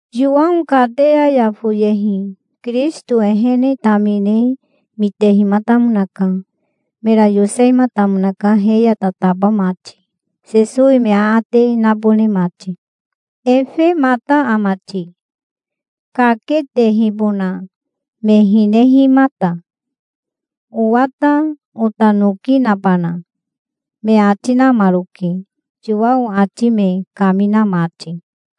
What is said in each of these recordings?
Yowao kateya ya foyehi Kirisito ehene tamine mitehimatamonaka. Mera yosehimatamonaka he ya tataba mati, Sesowi me aate nabone mati. "Efemata ama ti, kaketehibona me hinehimata? Owa ta ota noki nabana?" me ati namaroke, Yowao ati me kamina mati.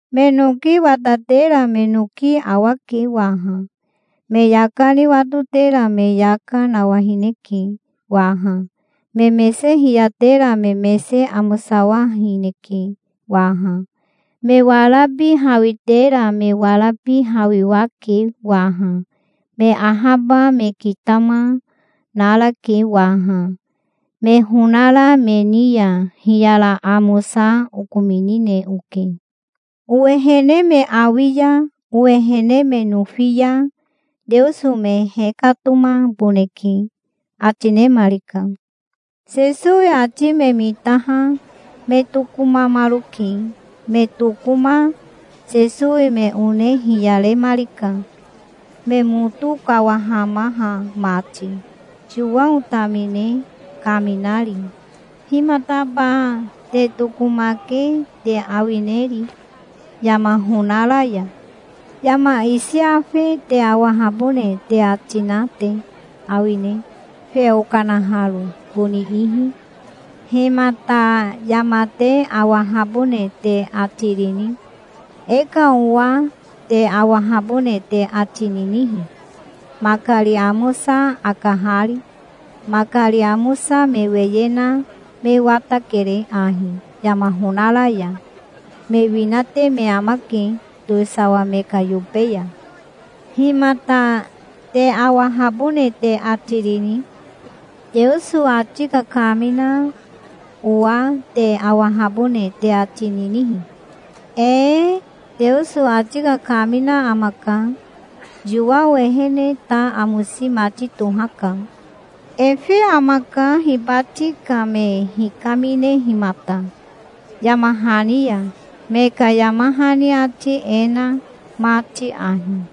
Me noki awatera me noki awake waha. Me yaka ni watotera me yaka nawahineke waha. Me mese hiyatera me mese amosawahineke waha. Me warabi hawitera me warabi hawiwake waha. Me ahaba me kitama, narake waha. Me honara me ni ya hiyara amosa okominine oke. Owehene me awi ya owehene me nofi ya Teoso me hekatomaboneke", ati nemarika. Sesowi ati me mitaha me tokomamaroke. Me tokoma Sesowi me one hiyaremarika, me moto kawahamaha mati, Yowao tamine kaminari. "Himataba te tokomake te awineri yama honara ya? Yama isi afe te awahabone te ati na te awine, feo kanaharo boni ihi? Himata yama te awahabone te ati rini? E ka owa te awahabone te ati ninihi, makari amosa akahari? Makari amosa me weye na me watakere ahi yama honara ya. Me winate me amake towisawa me ka yobe ya. Himata te awahabone te ati rini? Teoso ati kakamina owa te awahabone te ati ninihi? Ee, Teoso ati kakamina amaka. Yowao ehene ta amosi mati tohaka. Efe amaka hibati ka me hikaminehimata, yama hani ya, me ka yama hani ati e na mati ahi: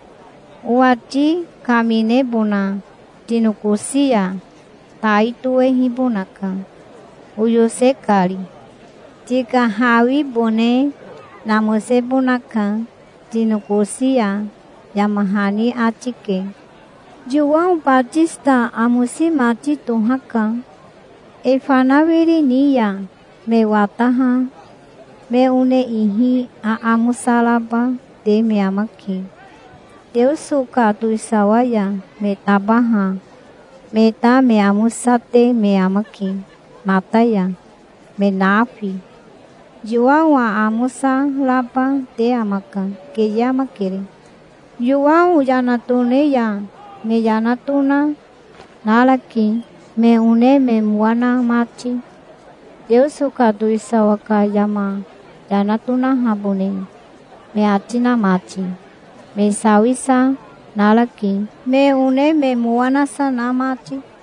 'Owati kaminebona tinokosi ya tai tohehibonaka, oyose kari. Tika hawibone namosebonaka tinokosi ya', yama hani ati ke. Yowao Batisita amosi mati tohaka. E fanawiri ni ya me wataha me one ihi aamosa raba te me amake. Teoso ka towisawa ya me tabaha me ta me amosate me amake mata ya, me nafi. Yowao aamosa raba te amaka. Keye amakere. Yowao yana tone ya me yana tona, narake, me one me mowa na mati, Teoso ka towisawa ka yama yana tonahabone me ati na mati. Me sawisa narake, me one me mowa nasa na mati.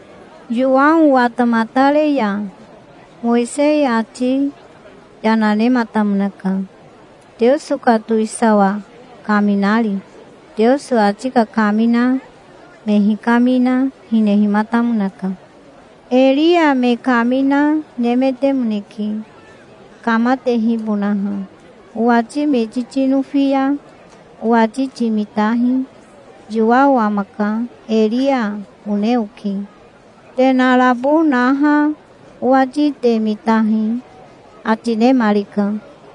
Yowao watamatare ya Mowisei ati yana nematamonaka, Teoso ka towisawa kaminari. Teoso ati kakamina me hikamina, hinehimatamonaka. Eria me kamina nemetemoneke, kamatehibonaha. Owati miti tinofi ya owati timitahi. Yowao amaka, Eria, one oke. Te narabo naha owati te mitahi", ati nemarika.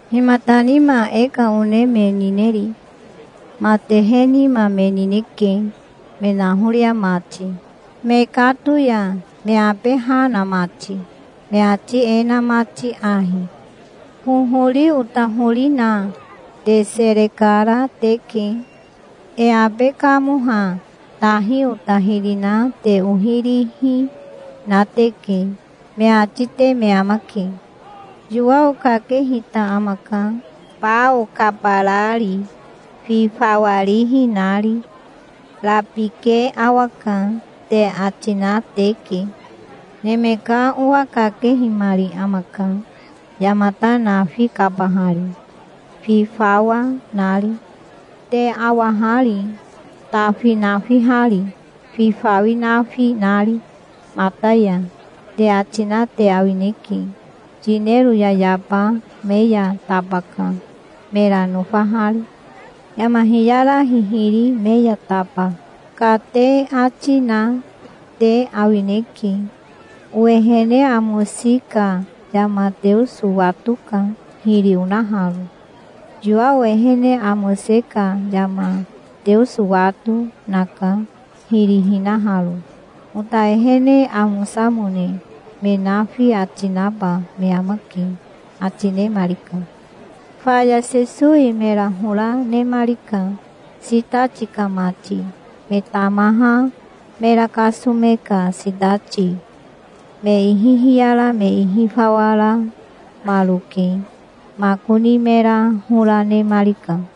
"Himata nima e ka one me nineri? Matehe nima me nineke me nahoria mati mekato ya, me abe ha na mati, me ati e na mati ahi: 'Hohori ota hori na te sere kara teke. E abe kamoha tahi ota hiri na te ohi rihi na teke', me ati te me amake. Yowao kakehita amaka, bao kabarari, fi fawa rihi nari. 'Rabike awaka', te ati na teke. Neme ka Owa kakehimari amaka, yamata nafi kabahari, fi fawa nari. 'Te awa hari, tafi nafihari, fi fawi nafi nari mata ya', te ati na te awineke. 'Yinero yayaba me ya tabaka, mera nofahari. Yama hiyara hihiri me ya taba, ka', te ati na te awineke. Owehene amosi ka yama Teoso watoka hiri onaharo. Yowao ehene amose ka yama Teoso wato, naka, hiri hinaharo. Ota ehene amosamone me nafi ati naba me amake", ati nemarika. Faya Sesowi mera hora nemarika, sitati ka mati, me tamaha mera kasome ka sitati. Me ihi hiyara me ihi fawa ramaroke makoni mera hora nemarika.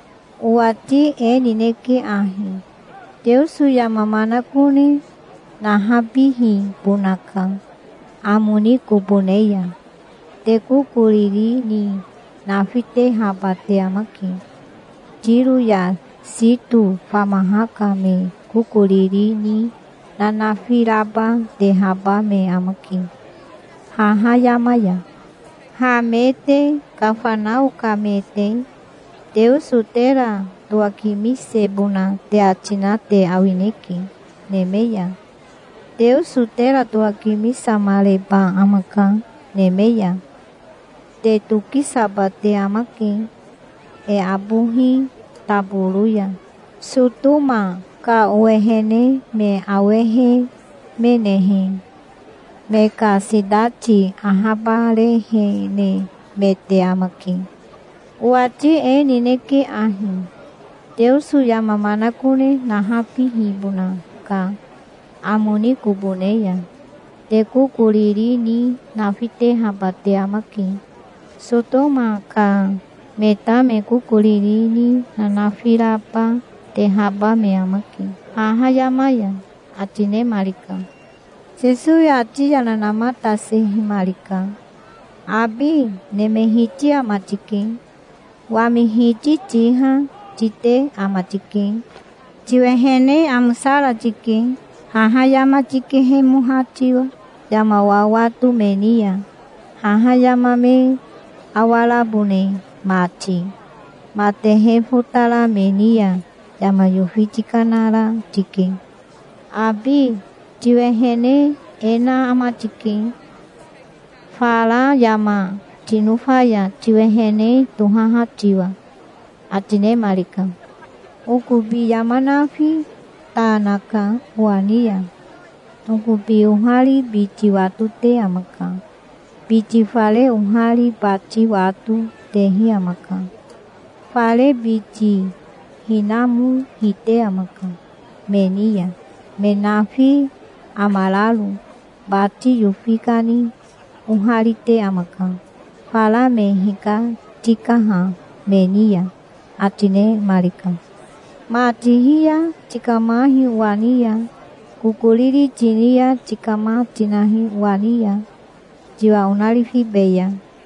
Owati e nineke ahi: Teoso yama manakone nahabihibona ka amo ni kobo ne ya te kokoriri ni nafitehaba te amake. Tiro ya Sito famaha ka me kokoriri ni nanafi raba tehaba me amake haha yama ya. Ha me te Kafanao ka me te, Teoso tera towakimisebona te ati na te awineke, neme ya. Teoso tera towakimisamareba amaka neme ya. Te tokisaba te amake e abohi taboro ya. Sotoma ka owehene me awehemenehe, me ka sitati ahabarehenemete amake. Owati e nineke ahi: Teoso yama manakone nahabihibona ka amo ni kobo ne ya te kokoriri ni nafitehaba te amake. Sotoma ka me ta me kokoriri ni nanafi raba tehaba me amake haha yama ya", ati nemarika. Sesowi ati yana namatasehimarika. "Abi neme Hiti ama tike. Wami Hiti tiha tite ama tike. Tiwehene amosara tike, haha yama tikehemoha tiwa, yama wawato me ni ya, haha yama me awarabone mati. Matehe fotara me ni ya yama yofi tikanara tike. Abi, tiwehene e na ama tike, fara yama tinofa ya tiwehene tohaha tiwa", ati nemarika. "Okobi yama nafi ta naka owa ni ya. Okobi ohari biti watote amaka. Biti fare ohari bati wato, tehi amaka. Fare biti hinamo hite amaka me ni ya, me nafi amararo. Bati yofi kani oharite amaka fara me hikatikaha me ni ya", ati nemarika. "Ma tihi ya tikamahi owa ni ya. Kokoriri tini ya tikama tinahi owa ni ya. Tiwa onarifibeya.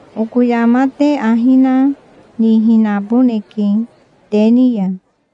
Oko yama te ahi na nihinaboneke te ni ya".